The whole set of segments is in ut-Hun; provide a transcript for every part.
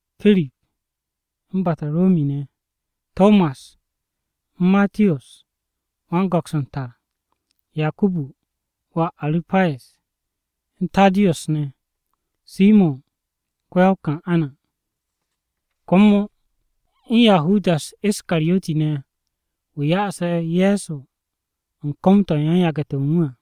Pirip, u̱n Bataromi ne̱. Tomas, u̱n Matiyos (wan-go̱ks u̱n tar), Yakubu (wà Aru̱payes), u̱n Taddiyus ne̱, Simo̱n (ko-ya-o-Kan'ana), Komo u̱n Yahudas Iskariyoti ne̱ (wu̱ ya'ase̱ Ye̱so u̱n kom-to̱ u̱n yan-yage̱-to̱ u̱n wu̱ à).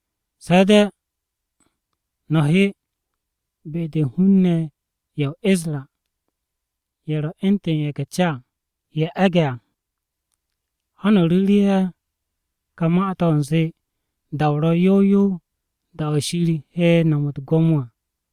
Se̱ de̱ no̱ he be-de u̱n hun-ne̱ ye̱ o-Isra ye̱ ro̱ u̱ntu̱n ca-ye̱ e̱ge̱ à. Ha no̱ ru̱ru̱ ye̱ ka ma-to̱ u̱nze, ‘Da-o ro̱ yow yow, da-o̱ Shir he no̱m u̱t-gwo̱mo à.’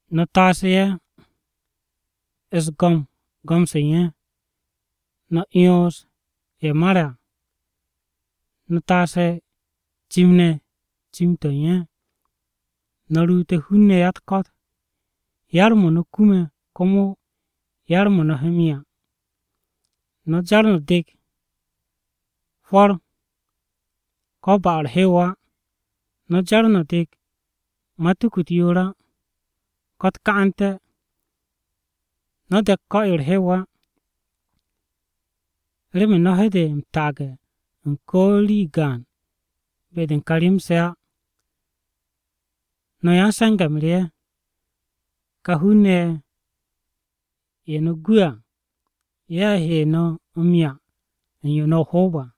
No̱ taas ya-u̱s-go̱m go̱m-se u̱n ye̱. No̱ 'yons ye̱ mare̱ à. No̱ taas cim-ne̱ cim-to̱ u̱n ye̱. No̱ ruute̱ hun-ne̱ ya-u̱t-ko̱t. Yar-mo̱ no̱ kume̱, komo yar-mo̱ no̱ he m-'ya. “No̱ jar no̱ dek hwo̱r hap-o no̱ ko̱ ba-o̱ u̱r-hew á. No̱ jar no̱ de̱k matuku-u̱t yoor á, ko̱ u̱t-ka'ante̱. No̱ de̱k ko̱-yo u̱r-hew á. Remen no̱ he de m-taage̱ u̱n ko̱ rii gaan be-de u̱n ka rem-se à. No̱ yan-se̱nge̱-m re ye̱. Ka hun-ne̱ ye̱ no̱ gu'e̱ à ye̱ he no̱ m-'ya u̱n yo no̱ o-hoob à.”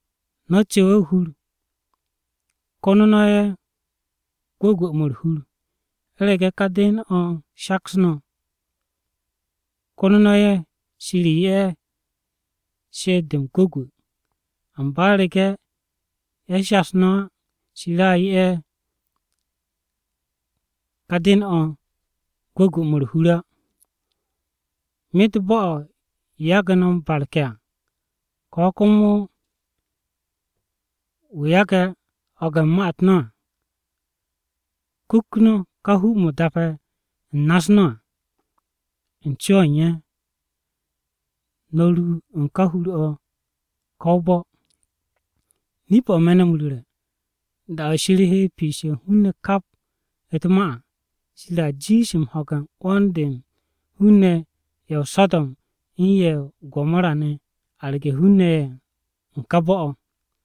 No̱ cu̱we̱ o-hur, kono no̱ ye̱ gwu̱gwu̱-mo̱ u̱r-hur. U̱rege̱ ká den-o̱ shaks no̱, kono no̱ ye̱ Shir 'ye ye̱ she'et-de m-gwu̱gwu̱. Amba u̱rege̱ ye̱ shas no̱ á, Shir a 'ye ká den-o̱ gwu̱gwu̱-mo̱ u̱r-hur á. Myet bo̱-o̱ yagu̱ no̱ m-barke̱ à, ko̱ komo wu̱ yage̱ ho̱ge̱ u̱n ma-u̱t no̱ à, kukt no̱ ká hu-mo̱ dape̱ u̱n na-u̱s no̱ à, u̱n co-o̱ u̱n ye̱, no̱ ru u̱n ká hur-o̱ ko̱ ká bo̱-o̱. Nip-o̱ me̱ no̱ m-ru̱re̱, da-o̱ Shir he piishe̱ u̱n hun-ne̱ kap u̱t-ma à, Shir a jiish m-ho̱ge̱ u̱n 'wo̱n-de u̱n hun-ne̱ ye̱ o-So̱do̱m u̱n ye̱ o-Gomora ne̱ arge̱ hun-ne̱ ye̱ u̱n ká bo̱-o̱.”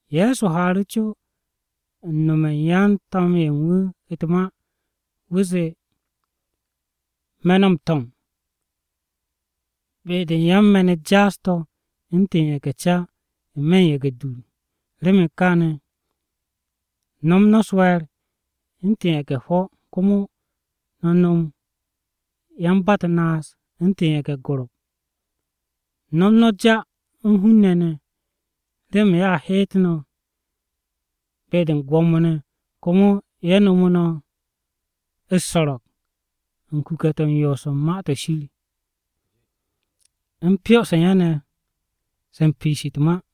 Ye̱so haaru̱ co u̱n nome̱ u̱n yan-To̱m-ye̱ u̱n wu̱ u̱t-ma. Wu̱ zee, “Me̱ no̱ m-to̱m be-de u̱n yan-me̱n-u̱t jaas-to̱ u̱ntu̱n ye̱ge̱-ca n-me̱ ye̱ge̱-dur. Remen kaane̱ no̱m no̱ u̱s-we̱e̱r u̱ntu̱n ye̱ge̱-hwo̱, komo no̱ nom yan-ba-u̱t-naas u̱ntu̱n ye̱ge̱-gorop. No̱m no̱ ja u̱n hun-ne̱ ne̱, remen ye̱a heet no̱ be-de u̱n gwo̱mo-ne̱, komo ye̱ nomo no̱ u̱s-so̱ro̱g u̱n kuke̱-to̱ u̱n yoos u̱n Ma-to̱ Shir u̱n pyo-se u̱n ye̱ ne̱ se piish u̱t-ma.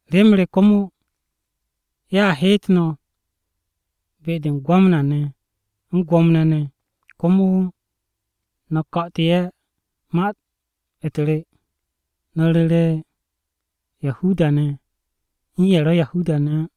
Rem re komo, ye̱a heet no̱ be-de u̱n Gwamna-ne̱ u̱n gwo̱mo-ne̱ ne̱, komo no̱ ko̱'o̱tu̱ ye̱ ma-u̱t re. No̱ ru̱re̱ Yahuda-ne̱ u̱n ye̱ ro̱ Yahuda-ne̱ á.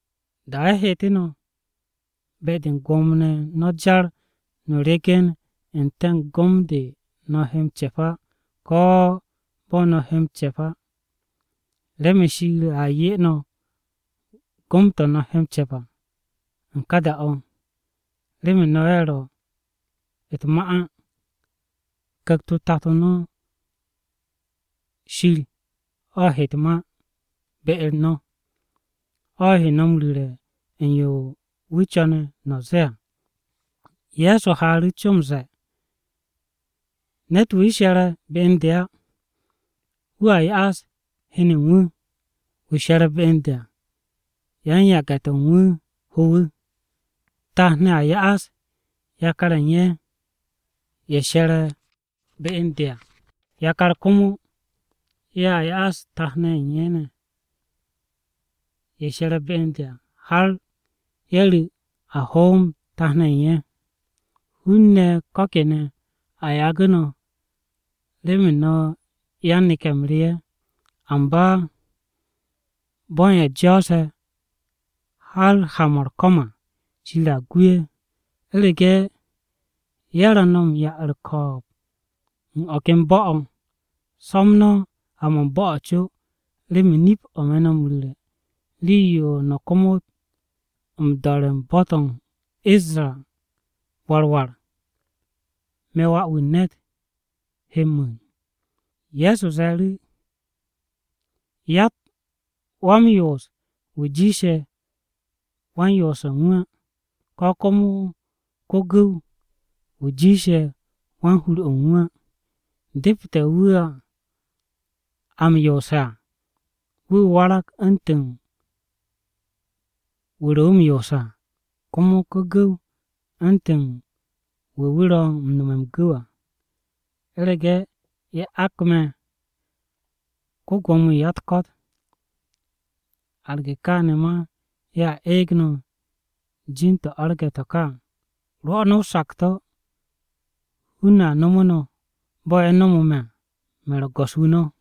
Da-o̱ ye̱ heetu̱ no̱, be-de u̱t-gwo̱mo no̱ jar no̱ ryegen n-te̱ u̱n gom-de no̱ he m-ce̱p á, ko̱ bo̱ no̱ he m-ce̱p á. Remen Shir a 'ye no̱ gom-to̱ no̱ he m-ce̱p à, u̱n ká da-o̱. Remen no̱ ye̱ ro̱ u̱t-ma á, Ku̱kt-o Tato no̱ Shir o̱ he u̱t-ma be-u̱r no̱. O̱ he no̱ m-ru̱re̱ u̱n yo wu̱ co̱ne̱ no̱ zee à.” Ye̱so haaru̱ co m-ze̱e̱, “Ne̱t-wu̱ she̱re̱ be u̱n de á wu̱a ya'as heno u̱n wu̱, wu̱ she̱re̱ be u̱n de à, yan-yage̱-to̱ u̱n wu̱ ho wu̱. Tat-ne̱ a ya'as yakar-ye̱ u̱n ye̱, ye̱ she̱re̱ be u̱n de à. Yakar komo ye̱a ya'as tat-ne̱ u̱n ye̱ ne̱, ye̱ she̱re̱ be u̱n de à har ye̱ ru̱ a hoom tat-ne̱ u̱n ye̱. Hun-ne̱ ko̱ kene̱ a yagu̱ no̱ remen no̱ yan-neke̱-m re ye̱. Amba bo̱ u̱n ye̱ jo̱o̱se̱ har ha-mo̱ u̱r-ko̱m à Shir a gu ye̱. U̱rege̱ ye̱ ro̱ no̱ m-'ya u̱r-ko̱o̱b u̱n o̱ ken bo̱-o̱, so̱m no̱ ha-mo̱ u̱n bo̱-o̱ co. Remen nip-o̱ me̱ no̱ m-ru̱re̱, rii-yo no̱ komot m-do̱re̱ u̱n bo̱-to̱ o-Isra war war, me̱ Wà-wu̱ u̱n ne̱t he mu̱u̱n.” Ye̱so ze̱e̱ru̱, “Yatt wa-m-yoos wu̱ jiishe̱ wan-yoose̱ u̱n wu̱ á, ko̱ komo ko-gu̱w-wu̱ jiishe̱ wan-hur-o̱ u̱n wu̱ á. Depete̱ wu̱ a m-yoose̱ à, wu̱ warag u̱ntu̱n wu̱ ro̱ wu̱ u̱r-yoos à, komo ko-gu̱w u̱ntu̱n wu̱ wu̱ ro̱ m-no̱me̱ m-gu̱w à. U̱rege̱ ye̱ ak me̱ ko-Gwo̱mo-wu̱ u̱n ya-u̱t-ko̱t, arge̱ kaane̱ ma ye̱a eeg no̱ jin-to̱ arge̱ to̱ ka à. Rwo̱ no̱ o-sakto̱ hun-ne̱ a nomo no̱ bo̱ ye̱ nomo me̱ à. Me̱ ro̱ go̱s-wu̱ no̱.”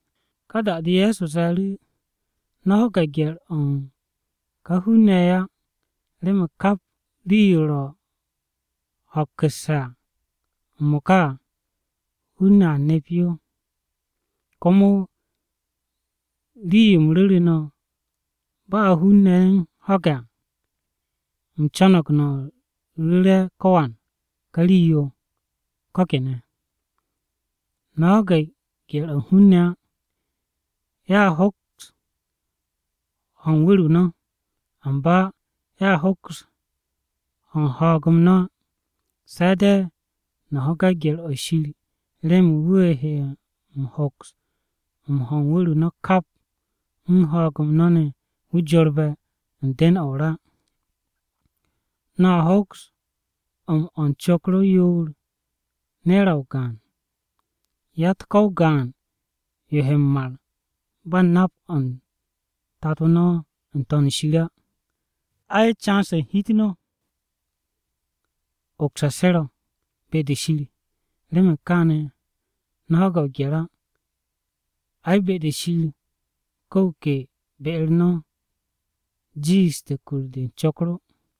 Ka da-de Ye̱so ze̱e̱ru̱, “No̱ ho̱ge̱ gye̱r-o̱ u̱n ka hun-ne̱ ye̱ á, remen kap rii-yo ro̱ ho̱kku̱sse̱ m-mo̱ka à, hun-ne̱ a neps yo. Komo rii-yo u̱m ru̱ru̱ no̱ ba hun-ne̱ u̱n ho̱ge̱ á, u̱m co̱no̱g no̱ ru̱re̱ ko̱wan ka rii-yo ko̱ kene̱. “No̱ ho̱ge̱ gye̱r-o̱ u̱n hun-ne̱ á. Ye̱a hoks ho u̱n wu̱r-o no̱, amba ye̱a hoks ho u̱n ho̱o̱g-m no̱ á. Se̱ de̱ no̱ ho̱ge̱ gye̱r-o̱ Shir remen wu̱ he m-hoks m-ho o-wu̱r kap m-ho̱o̱g ne̱ wu̱ jorbe̱ u̱n den-o̱ o-ra. No̱a hoks m-o̱ u̱n cokro yoor ne̱ra o-gaan. Yatt ko̱ o-gaan yo he m-mar ba u̱n nap-o̱ u̱n Tato no̱ n-To̱n shir á. Ay, can-se u̱n hi-u̱t no̱ ma ogse̱ se ro̱ be-de Shir. Remen kaane̱, no̱ ho̱ge̱ o-gye̱r á. Ai, be-de Shir ko wu̱ ke be-u̱r no̱ jiishte̱ kur-de u̱n cokro.”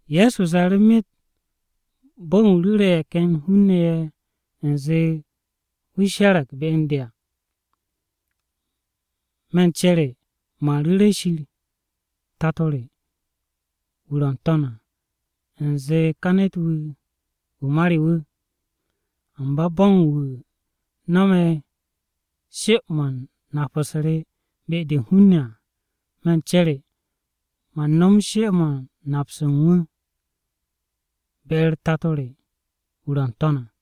Ye̱so ze̱e̱ru̱, “Myet bo̱ u̱n wu̱ ru̱re̱ ye̱ ken hun-ne̱ ye̱ u̱nze wu̱ she̱re̱g be u̱n de à, me̱ u̱n cere man ru̱re̱ Shir Tato re wu̱ ro̱ n-To̱n à, u̱nze ka ne̱t-wu̱, wu̱ ma re wu̱. Amba bo̱ u̱n wu̱ no̱me̱ she-mo̱ u̱n nap-u̱s re be-de u̱n hun-ne̱ à, me̱ u̱n cere, man nom she-mo̱ u̱n nap-se u̱n wu̱ be-u̱r Tato re wu̱ ro̱ n-To̱n à.”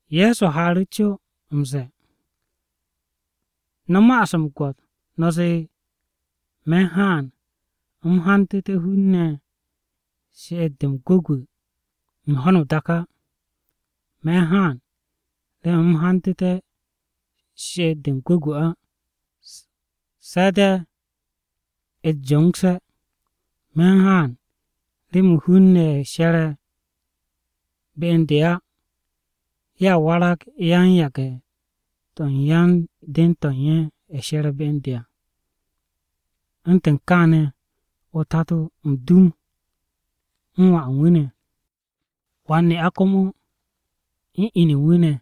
Ye̱so haaru̱ co m-ze̱e̱, “No̱ ma'as m-gwo̱t no̱ zee me̱ u̱n haan u̱m hantu̱té̱ hun-ne̱ she'et-de m-gwu̱gwu̱ u̱n ho̱no o-dak á. Me̱ u̱n haan remen u̱m hantu̱té̱ she'et-de m-gwu̱gwu̱ á, se̱ de̱ u̱t-jongse̱. “Me̱ u̱n haan remen hun-ne̱ ye̱ she̱re̱ be u̱n de á. “ ‘Ye̱a warag yan-yage̱-to̱ u̱n yan-den-to̱ ye̱ she̱re̱ be u̱n de à. U̱ntu̱n kaane̱: o-Tato m-dum u̱n wà u̱n wu̱ ne̱, wan-ne'a komo u̱n inu u̱n wu̱ ne̱,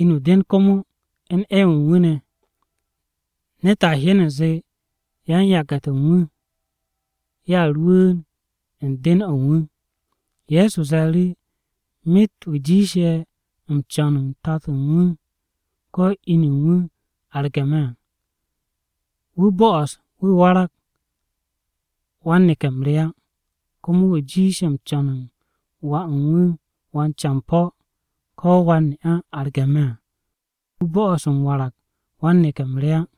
Inu o-den komo u̱n 'ew-wu̱ u̱n wu̱ ne̱. Ne̱t a hyen u̱nze yan-yage̱-to̱ u̱n wu̱, ye̱a rwu̱u̱n u̱n den-o̱ u̱n wu̱.’” Ye̱so ze̱e̱ru̱, “Myet wu̱ jiishe̱ m-co̱n u̱n tato u̱n wu̱ ko̱ inu u̱n wu̱ arge̱ me̱ à, wu̱ bo'os wu̱ warag wan-neke̱-m re á. Komo wu̱ jiishe̱ m-co̱n u̱n wà u̱n wu̱ wan-campo̱ ko̱ wan-ne'a arge̱ me̱ à, wu̱ bo'os m-warag wan-neke̱-m re á.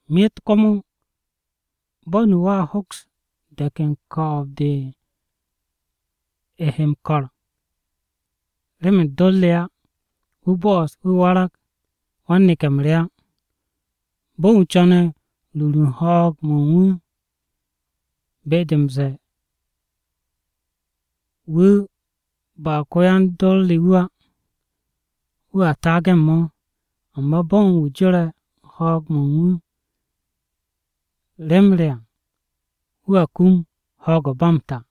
Myet komo bo̱ u̱n wu̱ a hoks de̱k u̱n ko̱o̱b-de he m-ko̱r remen dor re á, wu̱ bo̱o̱s wu̱ warag wan-neke̱-m re á. Bo̱n wu̱ co̱ne̱ rur u̱n ho̱o̱g-mo̱ u̱n wu̱ à, be-de m-ze̱e̱ wu̱ ba ko-yan-dor re wu̱ á, wu̱a taage̱ u̱n mo̱. Amba bo̱ u̱n wu̱ jore̱ ho̱o̱g-mo̱ u̱n wu̱ rem re à, wu̱a kum ho̱o̱g-o ba m-ta.”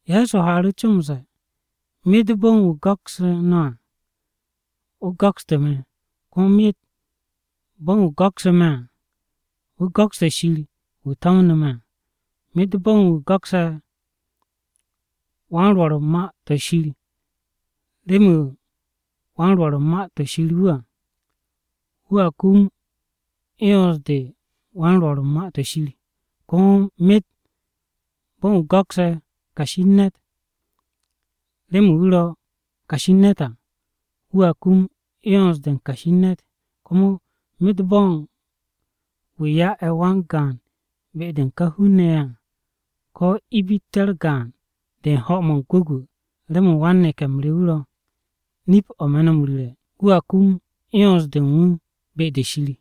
Ye̱so haaru̱ co m-ze̱e̱, “Myet bo̱ u̱n wu̱ go̱kse̱ no̱ à, wu̱ go̱kstu̱ me̱, komo myet bo̱ u̱n wu̱ go̱ksu̱ me̱ à, wu̱ go̱kste̱ Shir wu̱ to̱mnu̱ me̱ à. Myet bo̱ u̱n wu̱ go̱kse̱ wan-Rwo̱r u̱n Ma-to̱ Shir remen wu̱ wan-Rwo̱r u̱n Ma-to̱ Shir wu̱ à, wu̱a kum 'yons-de u̱n wan-Rwo̱r u̱n Ma-to̱ Shir. Komo myet bo̱ u̱n wu̱ go̱kse̱ kashi u̱n ne̱t remen wu̱ ro̱ kashi u̱n ne̱t à, wu̱a kum 'yons-de u̱n kashi u̱n ne̱t. Komo myet bo̱ u̱n wu̱ ya'e̱ wan-gaan be-de u̱n ká hun-ne̱ ye̱ à, ko̱ ibitte̱-u̱r gaan-de u̱n ho̱-mo̱ m-gwu̱gwu̱ remen wan-neke̱-m re wu̱, nip-o̱ me̱ no̱ m-ru̱re̱, wu̱a kum 'yons-de u̱n wu̱ be-de Shir.”